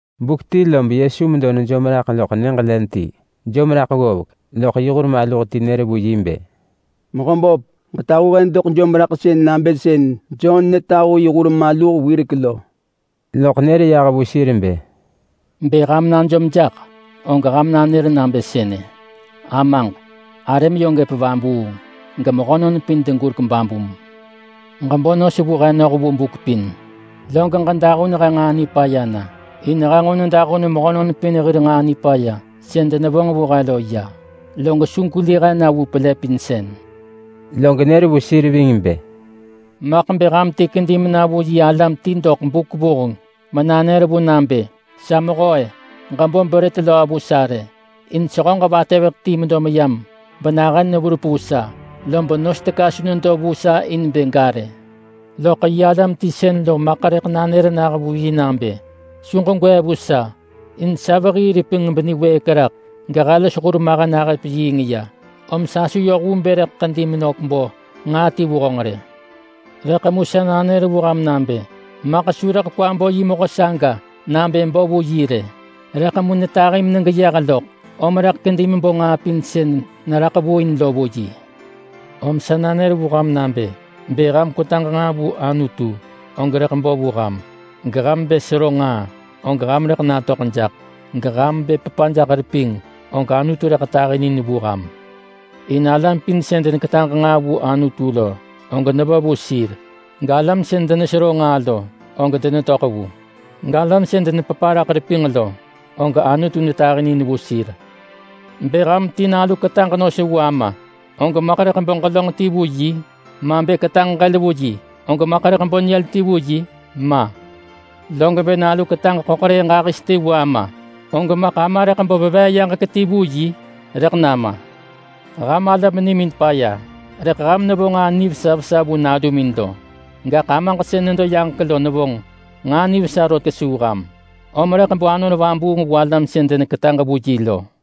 Buk ti lob Yesu medo nejom raḳ loḳ nyëġ len ti. Jom raḳ ggovek, loḳ yi hur maluh ti nër vu yi bë, “Mehöböp, ġetahu he doḳ jomraḳsën nabë sën Jon netahu yi hur maluh wirek lo.” Loḳ nër yah vu sir bë, “Bë ham najom jaḳ, og ham nanër nabë sënë: ‘Amaġ, arëm yö gëp vabuung. Gemehönon pin degurek babum. Ġebo nos vu he noh vu buk pin. Log ġedahun he nġaa nipaya na. In he nġo nedahun mehönon pin hir nġaa nipaya sën denevonġ vu he lo ya. Log su gweli he na vu pelëpinsën.’” Log nër vu sir ving bë, “Maḳ bë ham ti kedi mena vu yi alam ti doḳ buk vuheng menanër vu nabë, ‘Sa mehö-e! Ġebo brët löö vu sa rë, in sehöġ vatëveḳ ti medo meyam benahën neverup vu sa, lob nos teka su nedo vu sa in bë ga rë.’ Loḳ yi alam ti sën lo maḳ rëḳ nanër nah vu yi nabë, ‘Su ġegwee vu sa. In sa vehii repinġ beniwëëk raḳ gehe los hurmahen ahëp yiing ya; om sa su yoh vu bë rëḳ ḳedi menök bo nġaa ti vu honġ rë.’ Rëḳ mu sa nanër vu ham nabë: Maḳ su rëḳ kwa bo yi mehö saga nabë bo vu yi rë, rëḳ mu netahi menegeyeh loḳ, om rëḳ kedi mebo nġaa pin sën neraḳ vu in lo vu yi. Om sa nanër vu ham nabë: Bë ham kwetaġ nġaa vu Anutu, og rëḳ bo vu ham. Geham bë sero nġaa, og ham rëḳ natöḳ jaḳ. Geham bë pepa jaḳ repinġ, og Anutu rëḳ tahinin vu ham. In alam pin sën deneketaġ nġaa vu Anutu lo, og nevo vu sir. Galam sën denesero nġaa lo, og denetöḳ vu. Galam sën denepepa raḳ repinġ lo, og Anutu netahinin vu sir. Bë ham ti nalu ketaġ nos vu ama, og maḳ rëḳ bo ġelönġ ti vu yi? Ma bë ketaġ ġël vu yi, og maḳ rëḳ bo nyël ti vu yi? Ma! Log bë nalu ketaġ ḳöḳrëëh ġahis ti vu ama, og maḳ ama rëḳ bo veveeyaġek ti vu yi? Rëḳ nama! Ham alam nimin paya rëḳ ham nevo nġaa nivesa vesa vu nalumin lo. Gaḳ Amaġ sën nedo yaġek lo nevonġ nġaa nivesa rot kesuu ham, om rëḳ bo Anon Vabuung vu alam sën deneketaġ vu yi lo.”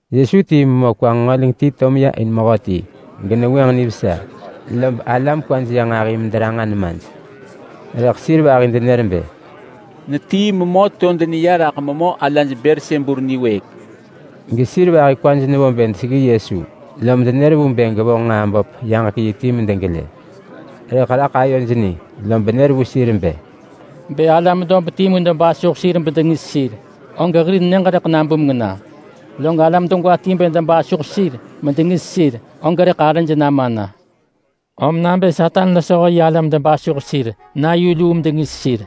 Yesu tii memö kwa nġengöleng ti to meya in mehöti, genevengwënġ nivesa. Lob alam kwaj neya nġahi mederanġa nemaj. Rëḳ sir vahi denenër bë, “Netii memö to deneya raḳ memö hir ala Belsebul niwëëk.” Gesir vahi kwaj nevo bë deseggi Yesu, lom denër vu bë gevonġ nġaa böp yaġek yi ti medegelë. Rëḳ raḳ ayoj ni, lob nër vu sir bë, “Bë alam dob timu debasuh sir bedengis sir, og hir nyëġ rëḳ nabumeng na. Log alam degwa ti bë debasuh sir medengis sir, og rëḳ arëj nama na. Om nabë Satan losho yi alam debasuh sir na yu luu medengis sir,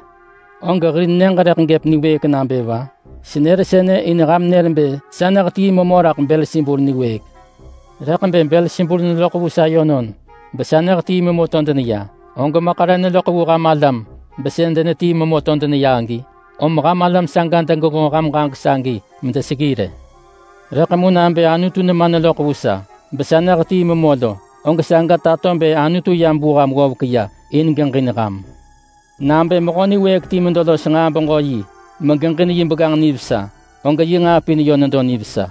og hir nyëġ rëḳ gëp niwëëk nabë va? Senër sënë in ham nër bë sa nehetii memö raḳ Belsebul niwëëk. Rëḳ bë Belsebul neloḳ vu sa yönon besa nehetii memö to deneya, og maḳ re neloḳ vu ham alam besën denetii memö to deneya agi? Om ham alam saga degenġo ham ġaġek sagi medeseggi rë. Rëḳ mu nabë Anutu nema neloḳ vu sa, besa nehetii memö lo, og saga tato bë Anutu yam vu ham ggovek ya in bë geġin ham. Nabë mehö niwëëk ti medo los nġaa-beġö-yi megeġin yi begganġ nivesa, og yi nġaa pin yö nedo nivesa.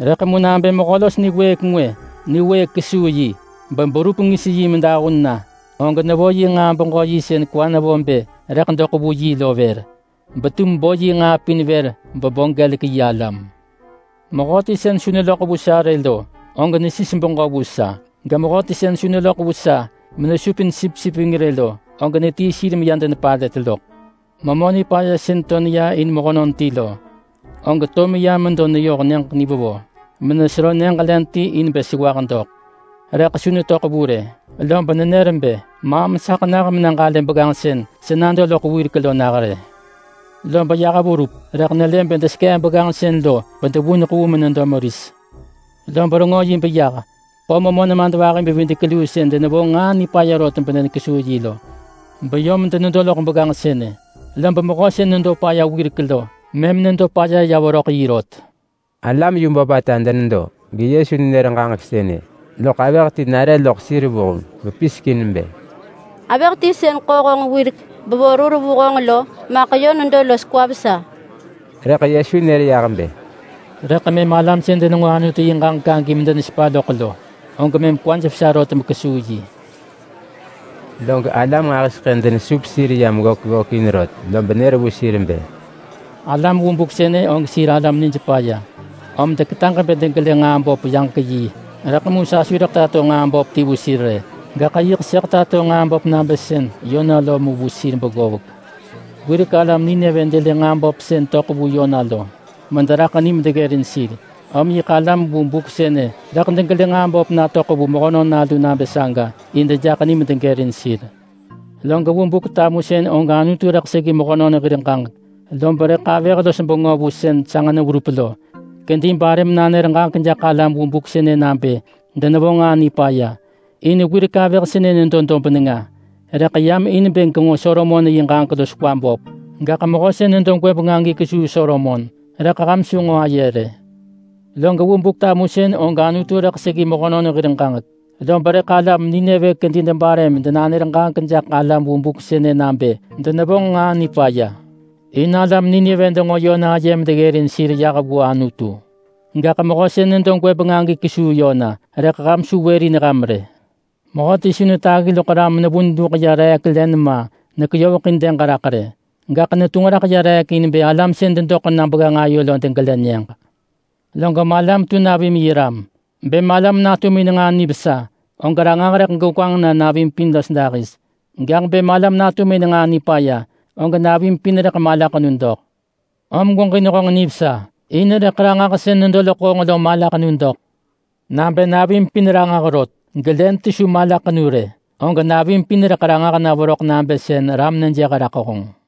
Rëḳ mu nabë mehö los niwëëk ngwë niwëëk kesuu yi beberup ngis yi medahun na, og nevo yi nġaa-beġö-yi sën kwa nevo bë rëḳ doḳ vu yi lo vër, betum bo yi nġaa pin vër bebo gelek yi alam. Mehöti sën su neloḳ vu sa rë lo, og nesis beġö vu sa. Gemehöti sën su neloḳ vu sa menesupin sipsip ving rë lo, og netii sir meya denepalët loḳ.” “Memö nipaya sën to neya in mehönon ti lo, og to meya medo neyoh nyëġ nivevo menesero nyëġ len ti in bë sewah doḳ. Rëḳ su netöḳ vu rë lob nenër bë, ‘Maam saḳ nah mena ġalë begganġ sën sa nado loḳ wirek lo rë.’ Lob yah verup rëḳ nelë bë desekee begganġ sën lo bedevuneḳ vu menedo meris. Lob rengö yi beyah ḳo memö nemadvahi-bevidek-luu sën denevonġ nġaa nipaya rot medenekesuu yi lo, beyom denedo loḳ begganġ sënë. Lob mehö sën nedo paya wirek lo, mëm nedo paya ya veröḳ yi rot.” Alam yu böpata denedo, geYesu nenër ġaġek sënë, loḳ avëh ti nare loḳ sir vuheng bepisek in bë, “Avëh ti sën ḳo honġ wirek, bevo rur vu honġ lo, maḳ yö nedo los kwa vesa.” Rëḳ Yesu nër yah bë, “Rëḳ mëm alam sën denenġo Anutu yi ġaġek agi medenesepa loḳ lo, og mëm kwaj vesa rot mekesuu yi.” Log alam nġahiseḳë denesup sir yam ggök ggökin rot, lob nër vu sir bë, “Alam vu buk sënë og sir alam nij paya, om deketaġ bë degelë nġaa böp yaġek yi. Rëḳ mu sa su rëḳ tato nġaa böp ti vu sir rë. Gaḳ yiḳ sëḳ tato nġaa böp nabë sën Yona lo mu vu sir beggovek. Wirek alam Nineve delë nġaa böp sën töḳ vu Yona lo mederaḳ ni medeggërin sir. Om yiḳ alam vu buk sënë rëḳ degelë nġaa böp natöḳ vu Mehönon Nalu nabë saga in dejaḳ ni medegërin sir. Log vu Buk-tamusën og Anutu rëḳ seggi mehönon hir ġaġek, lob rëḳ avëh-los-bengö vu sën sanġ neverup lo kedi bare menanër ġaġek jaḳ alam vu buk sënë nabë denevonġ nġaa nipaya. In wirek avëh sënë nedo dob nenga, rëḳ yam in bë genġo Solomon yi ġaġek los kwa böp. Gaḳ mehö sën nedo gwëbeng agi kesuu Solomon, rëḳ ham su nġo aye rë. Log vu Buk-tamusën og Anutu rëḳ seggi mehönon hir ġaġek, lob rëḳ alam Nineve kedi debare medenanër ġaġek jaḳ alam vu buk sënë nabë denevonġ nġaa nipaya. In alam Nineve denġo Yona aye medeggërin sir yah vu Anutu. Gaḳ mehö sën nedo gwëbeng agi kesuu Yona, rëḳ ham su wërin ham rë.” “Mehöti su netaggi loḳ ram menevun luḳ ya reek len ma, nekeyoveḳin dëg raḳ rë. Gaḳ netunġ raḳ ya reek in bë alam sën dedoḳ na begganġ ayo lo degelë nyëġ. Log malam tu navim yi ram. Bë malam natum in nġaa nivesa, og ranġah rëḳ gegwanġ na navim pin los dahis. Gaḳ bë malam natum in nġaa nipaya, og navim pin rëḳ malaḳenu doḳ. Om gweġin honġ nivesa, in rëḳ ranġah sën nedo loḳ honġ lo malaḳenu doḳ. Nabë navim pin ranġah rot, gelen ti su malaḳenu rë, og navim pin rëḳ ranġah na veröḳ nabë sën ram nejëh raḳ honġ.”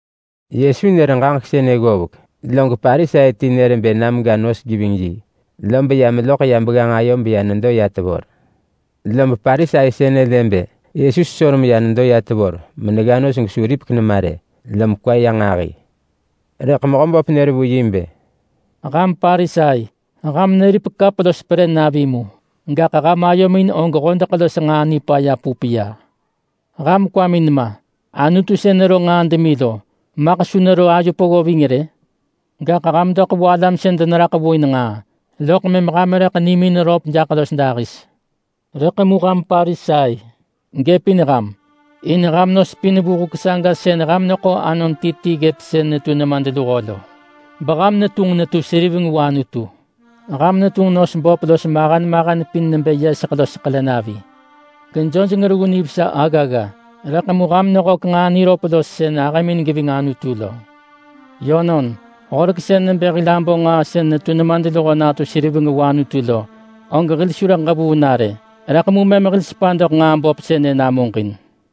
Yesu nër ġaġek sënë ggovek, log Parisai ti nër bë na mega nos geving yi. Lob ya meloḳ ya begganġ ayo beya nedo ya tevor. Lob Parisai sënë lë bë Yesu sesor meya nedo ya tevor menegga nos gesu ripek nema rë, lom kwa ya nġahi. Rëḳ Mehöböp nër vu yi bë, “Ham Parisai, ham neripek kap los perë navi mu, gaḳ ham ayomin og hodeḳ los nġaa nipaya pup ya. Ham kwamin ma! Anutu sën nero nġaa demi lo, maḳ su nero ayo peggo ving rë? Gaḳ ham doḳ vu alam sën deneraḳ vu in nġaa, loḳ mëm ham rëḳ nimin röp jaḳ los dahis. Rëḳ mu ham Parisai! Gëpin ham! In ham nos pin vu huk saga sën ham neḳo anon ti ti ggëp sën netu nemadluho lo, beham netunġ netu seriveng vu Anutu. Ham netunġ nos böp los mahen mahen pin nebë yeseḳ los ḳele navi, gejojeng reggu nivesa aggagga. Rëḳ mu ham nehök nġaa niröp los sën ahëmin geving Anutu lo. Yönon, horek sën nebë hil abo nġaa sën netu nemadluho natu seriveng vu Anutu lo, og hil su rëḳ ġevuu na rë. Rëḳ mu mëm hil sepa doḳ nġaa böp sënë namuġin.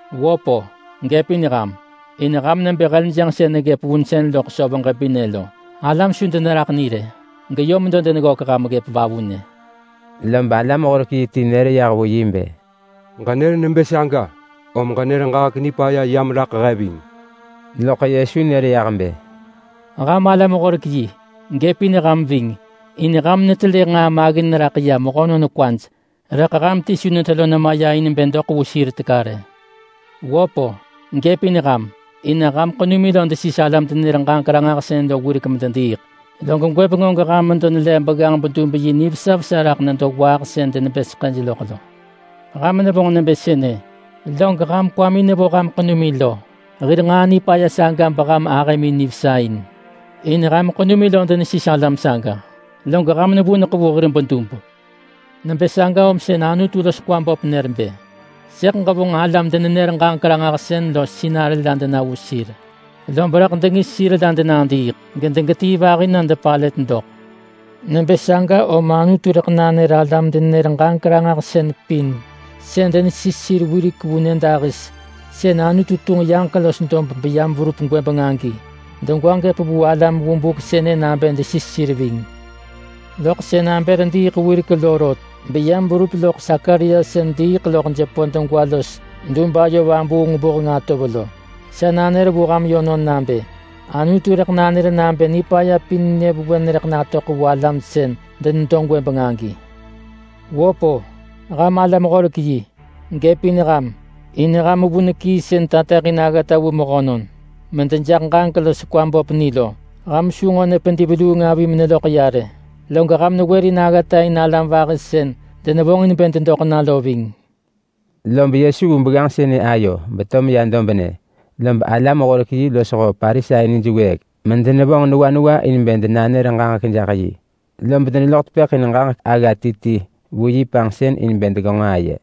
Wöp-o! Gëpin ham! In ham nebë heljënġ sën neggëp vunsën loḳ söv ġebinë lo. Alam su deneraḳ ni rë, geyö medo deneggök ham ggëp vavunë.” Lob alam-horek-yi ti nër yah vu yi bë, “Ġenër nebë saga, om ġenër ġaġek nipaya yam raḳ he ving.” Loḳ Yesu nër yah bë, “Ham alam-horek-yi, gëpin ham ving! In ham netelë nġaa maggin raḳ ya mehönon kwaj. Rëḳ ham ti su netelo nema ya in bë doḳ vu sir teka rë. Wöp-o! Gëpin ham! In ham ḳenumin lo desis alam-denenër-ġaġek-ranġahsën lo wirek medediiḳ, log gwëbeng og ham medo nelev begganġ-bedub-yi nivesa vesa raḳ nedo waaḳ sën denebë seḳëj loḳ lo. Ham nevonġ nebë sënë, log ham kwamin nevo ham ḳenumin lo hir nġaa nipaya saga beham ahëmin nivesa in. In ham ḳenumin denesis alam saga, log ham nevuneḳ vu hir bedub. Nebë saga om sën Anutu los kwa böp nër bë, ‘Sëḳ ġevonġ alam-denenër-ġaġek-ranġahsën los sinarë la dena vu sir, lob rëḳ dengis sir la denadiiḳ, gedegetii vahi na depalët doḳ.’ Nebë saga om Anutu rëḳ nanër alam-denenër-ġaġek-ranġahsën pin sën denesis sir wirek vu nyëdahis sën Anutu tunġ yaġek los dob beyam verup gwëbeng agi degwa gëp vu alam vu buk sënë nabë desis sir ving. Loḳ sën Abel diiḳ wirek lo rot, beyam verup loḳ Sakaria sën diiḳ loḳ jepö degwa los dub ayo vabuung vuheng atov lo. Sa nanër vu ham yönon nabë: Anutu rëḳ nanër nabë nipaya pin nyëvewen rëḳ natöḳ vu alam sën denedo gwëbeng agi. Wöp-o! Ham alam-horek-yi! Gëpin ham! In ham vun kii sën tateḳin aggata vu mehönon medejaḳ ġaġek los kwa böp ni lo. Ham su nġo nepedi veluung avi meneloḳ ya rë, log ham newërin aggata in alam vahi sën denevonġin bë dedoḳ na lo ving.” Lob Yesu vu begganġ sënë ayo beto meyah dobnë, lob alam-horek-yi losho Parisai nij wëëk medenevonġ newa newa in bë denanër ġaġek jaḳ yi. Lob deneloḳ tepëḳ in ġaġek agga ti ti vu yi panġsën in bë degenġo aye.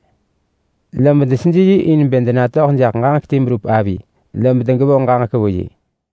Lob deseji yi in bë denatöḳ jaḳ ġaġek ti berup avi, lob degevonġ ġaġek vu yi.